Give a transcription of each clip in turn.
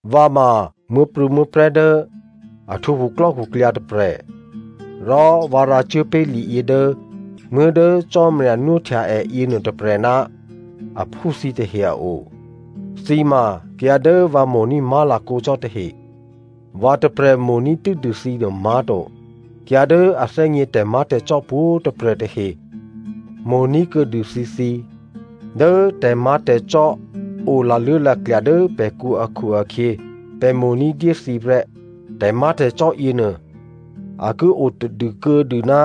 Vǎ ma muố̤prû̌muố̤prè̤́ dố a htwǒ khuklò́khuklyǎ tôprè̤ rò vǎ rǎcuốpé̤ liyě dố muố̤ dố Cò́marya nwóhtya è yěnuô tôprè̤ ná aphú thǐtahe a o. Thǐ ma kayǎ dố vǎ mo̤ní̤ má̤lakǒ cò́ tahe. Vǎ tôprè̤ mo̤ní̤ tû́dû thǐ nuô má̤to, kayǎ dố a thè́gně tè̤má̤tè̤cò́ pwǒ̤꤮ tôprè̤ tahe mo̤ní̤ kuô̌dû thǐthǐ. Dố tè̤má̤tè̤cò́ o laluố̤laklya̤ dố pè̤kǔ akhu-akhyě pè̤ mo̤ ní̤dyé thǐ prè́. Tè̤má̤tè̤cò́ yěnuô a ki o tadû kuô̌dû ná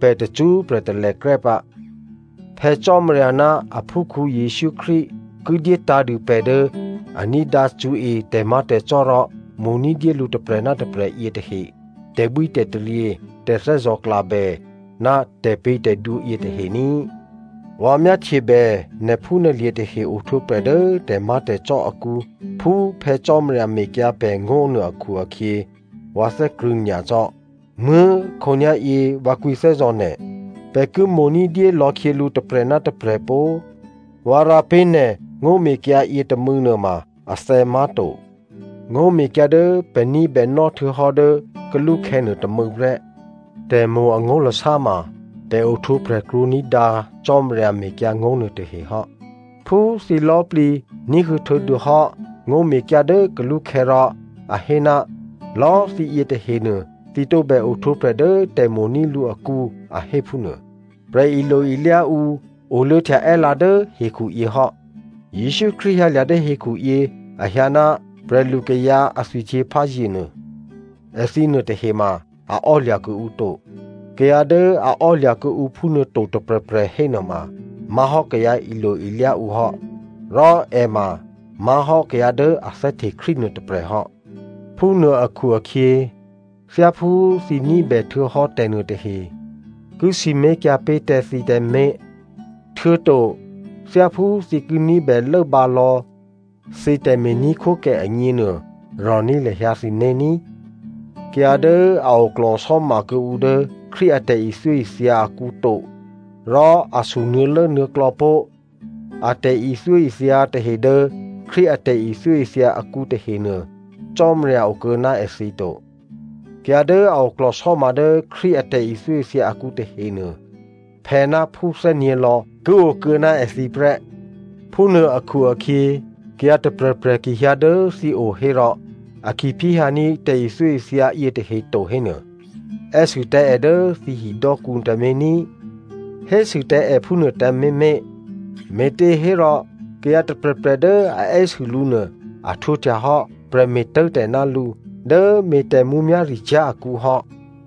pè̤ tacṳ́prè̤ talèkrè́ pǎ. Phè̌ Cò́marya ná aphúkhǔ Jesǔ Krístu ki dyétǎ̤dû pè̤ dố a ní̤dǎ cṳ̌e tè̤má̤tè̤cò́ rò mo̤ ní̤dyé lǔ tôprè̤ ná tôprè̤ yětahe tè̤bwítè̤taryě, tè̤thè́zò̤klabè ná tè̤pě̤tè̤dwǒ yětahe ní꤮. Vǎ myáhtyebè nè̤phúnè̤lye̤ tahe ohtwǒprè̤ dố tè̤má̤tè̤cò́ akǔ phú Phè̌ Cò́marya mekyǎ pè̤ ngó̤ nuô akhu-akhyě vǎ thè́krṳ̂̌ nyacò́. Muố̤꤮, khǒnyá̤yě vǎ kwǐthè́zò̤ nè̤, pè̤ ki mo̤ ní̤dyé lò̌ khyělǔ tôprè̤ ná tôprè̤ pó꤮. Vǎ rǎ pé̤ nè̤ ngó̤mekyǎ yětômû̌ nuôma athè̌ má̤to, ngó̤mekyǎ dố pè̤ ní̤bènò́ htuô̌hò́ dố kalúkhè̌ nuô tômû̌ prè́. Tè̤mo̤ angó̤lasá ma, pè̤ ohtwǒprè̤ krwǒ ní̤dǎ Cò́marya mekyǎngó̤ nuôtahe hò́. Phú thǐ lò̌꤮ plǐ ní̤huô̌ htuô̌dûhò́ ngó̤mekyǎ dố kalú khè̌ rò a hé, lò̌꤮ thǐyě tahenuô thǐ tǒbè ohtwǒprè̤ dố tè̤mo̤ní̤ lǔ akǔ, a hé phúnuô. Prè̤ilo-ilyá ǔ oluô̌htya è́lǎ dố hekhu yě hò́. Jesǔ Krístu hyǎlya̤ dố hekhuyě, a hyǎ ná prè̤lukayǎ a thwihtyěpházye nuô, èthǐ nuôtahe ma a ò́lya̤ kuô̌ǔ to. Kayǎ dố a ò́lya̤ kuô̌ǔ phúnuô to tôprè̤prè̤ hénuôma má̤hò́ kayǎ ilo-ilyá ǔ hò́, rò è ma má̤hò́ kayǎ dố a thè́hte Krístu nuô tôprè̤ hò́. Phúnuô akhu-akhyě, thyáphú thǐ ní̤bè htuô̌hò́ tè̤nuôtahe ki sǐmé̤kyǎ pé̤ tǎ thǐ tǎmé̤, htuô̌to thyáphú thǐ ki ní̤bè lốbǎ lò̌ thǐ tè̤me̤ní̤khwókè agněnuô, rò̤ní̤ lahyǎ thǐné̤ ní꤮. Kayǎ dố a oklò̤sò́ma kuô̌ǔ dố Krístu a tè̤ithyóithya akǔ to, rò a sunuô̌lốnuô̌klò̌ pó̤ a tè̤ithyóithya tahe dố Krístu a tè̤ithyóithya akǔ tahenuô, Cò́marya okuô̌ ná èthǐ to. Kayǎ dố a oklò̤sò́ma dố Krístu a tè̤ithyóithya akǔ tahenuô, phè̌náphú thè́nyě̤lò̌ ki okuô̌ ná èthǐ prè́. Phúnuô akhu-akhyě kayǎ tôprè̤prè̤ ki hyǎ dố thǐ o hérò a ki phyéhyǎní̤ tè̤ithyóithya yětahe to hénuô, è́sû tǎ è dố thǐ hidò́kǔ tǎmé̤ ní꤮. “Tè̤pě̤tè̤dwǒ ki odû ná nè̤ ní꤮,” hésû tǎ è phúnuô tǎmé̤ mé̤. Me̤těhérò kayǎ tôprè̤prè̤ dố a è́sû lǔ nuô, a htwǒhtyahò́ prè̤me̤ tố̤tè̤ ná lǔ dố me̤ tè̤mǔmyá̤ricyá̤ akǔ hò́.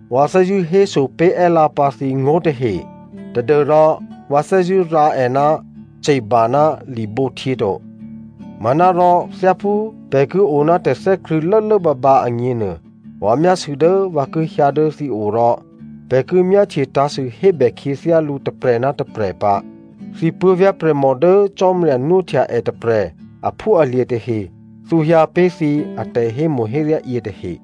Vǎ thè́zṳ̂́ héso pé̤ è́lǎ pǎ thǐ ngó̤tahe tadû́rò vǎ thè́zṳ̂́ rǎ è ná ce̤ba ná libǒhtyě to. Manárò thyáphú pè̤ ki o ná tè̤thè́krṳ̂̌ lốlốbǎbǎ agněnuô, vǎ myásû̌ dố vǎ ki hyǎ dố thǐ o rò pè̤ ki myáhtye tǎ̤sû hébè khyěthyálǔ tôprè̤ ná tôprè̤ pǎ. Thǐ puố̤vyá̤ prè̤mò dố Cò́marya nwóhtya è tôprè̤ aphúalye̤ tahe thǔhyǎ pé̤ thǐ atè̤hémo̤héryá yětahe.